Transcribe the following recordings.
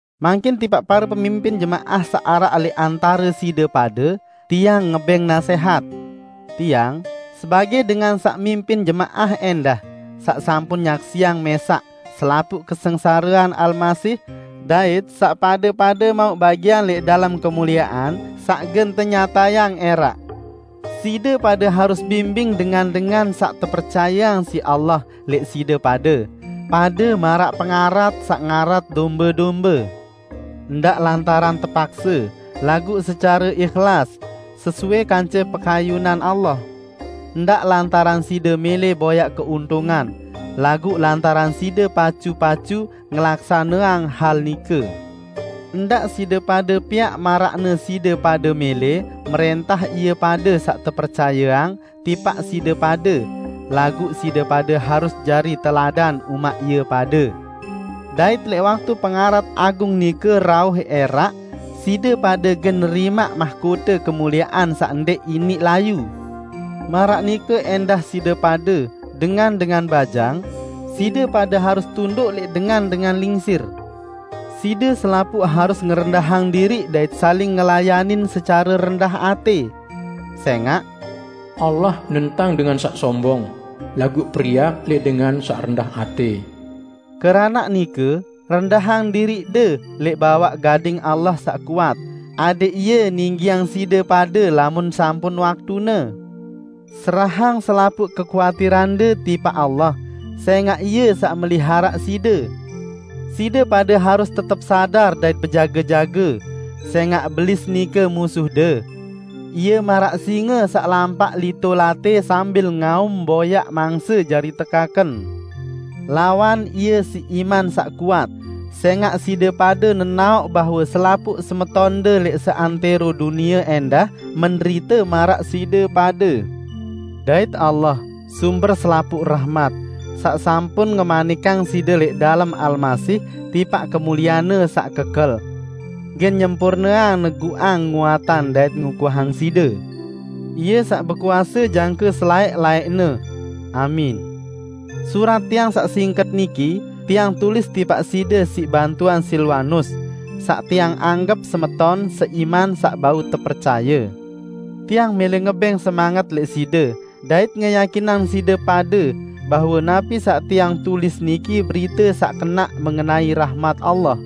Mangkin tipaq pare pemimpin jemaah saq araq lẽq antare side pade, tiang ngebẽng nasẽhat. Tiang, sebagẽ dengan saq mimpin jemaah ẽndah, saq sampun nyaksiang mẽsaq selapuq kesengsarean Almasih, dait saq pade-pade mauq bagian lẽq dalem kemuliean saq gen tenyatayang ẽraq. Side pade harus bimbing dengan-dengan saq tepercayeang siq Allah lẽq side pade, pade maraq pengarat saq ngarat dombe-dombe. Ndaq lantaran terpakse, laguq secare ihlas, sesuai kance pekayunan Allah; ndaq lantaran side mẽlẽ boyaq keuntungan, laguq lantaran side pacu-pacu ngelaksaneang hal nike. Ndaq side pade piaq maraqne side pade mẽlẽ mrẽntah ie pade saq tepercayeang tipaq side pade, laguq side pade harus jari teladan umaq ie pade. Dait lẽq waktu Pengarat Agung nike rauh ẽraq, side pade gen nerimaq mahkote kemuliean saq ndẽq iniq layu. Maraq nike ẽndah side pade, dengan-dengan bajang, side pade harus tunduk lẽq dengan-dengan lingsir. Side selapuq harus ngerendahang diriq dait saling ngelayanin secare rendah atẽ. Sẽngaq, "Allah nentang dengan saq sombong, laguq periak lẽq dengan saq rendah atẽ." Keranaq nike, rendahang diriqde lẽq bawaq gading Allah saq kuat, adẽq Ie ninggiang side pade lamun sampun waktune. Serahang selapuq kekuatirande tipaq Allah, sẽngaq Ie saq meliharaq side. Side pade harus tetep sadar dait bejage-jage, sẽngaq Belis nike musuhde. Ie maraq singe saq lampaq lito-latẽ sambil ngaum boyaq mangse jari tekaken. Lawan ie siq iman saq kuat, sẽngaq side pade nenaoq bahwe selapuq semetonde lẽq seantẽro dunie ẽndah menderite maraq side pade. Dait Allah, sumber selapuq rahmat, saq sampun ngemanikang side lẽq dalem Almasih tipaq kemuliean-Ne saq kekel, gen nyempurneang, neguqang, nguatang dait ngukuhang side. Ie saq bekuase jangke selaẽq-laẽqne! Amin. Surat tiang saq singket niki tiang tulis tipaq side siq bantuan Silwanus, saq tiang anggep semeton seiman saq bau tepercaye. Tiang mẽlẽ ngebẽng semanget lẽq side dait ngeyakinang side pade bahwe napi saq tiang tulis niki berite saq kenaq mengenai rahmat Allah.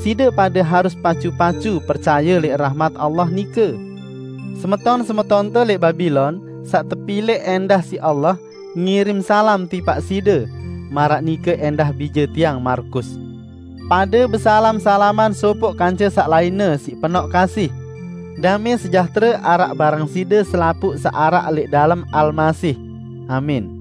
Side pade harus pacu-pacu percaye lẽq rahmat Allah nike. Semeton-semetonte lẽq Babilon, saq tepilẽq ẽndah siq Allah, ngirim salam tipaq side; maraq nike ẽndah bije tiang Markus. Pade besalam-salaman sopoq kance saq lainne siq penoq kasih. Damẽ sejahtere araq bareng side selapuq saq araq lẽq dalem Almasih. Amin.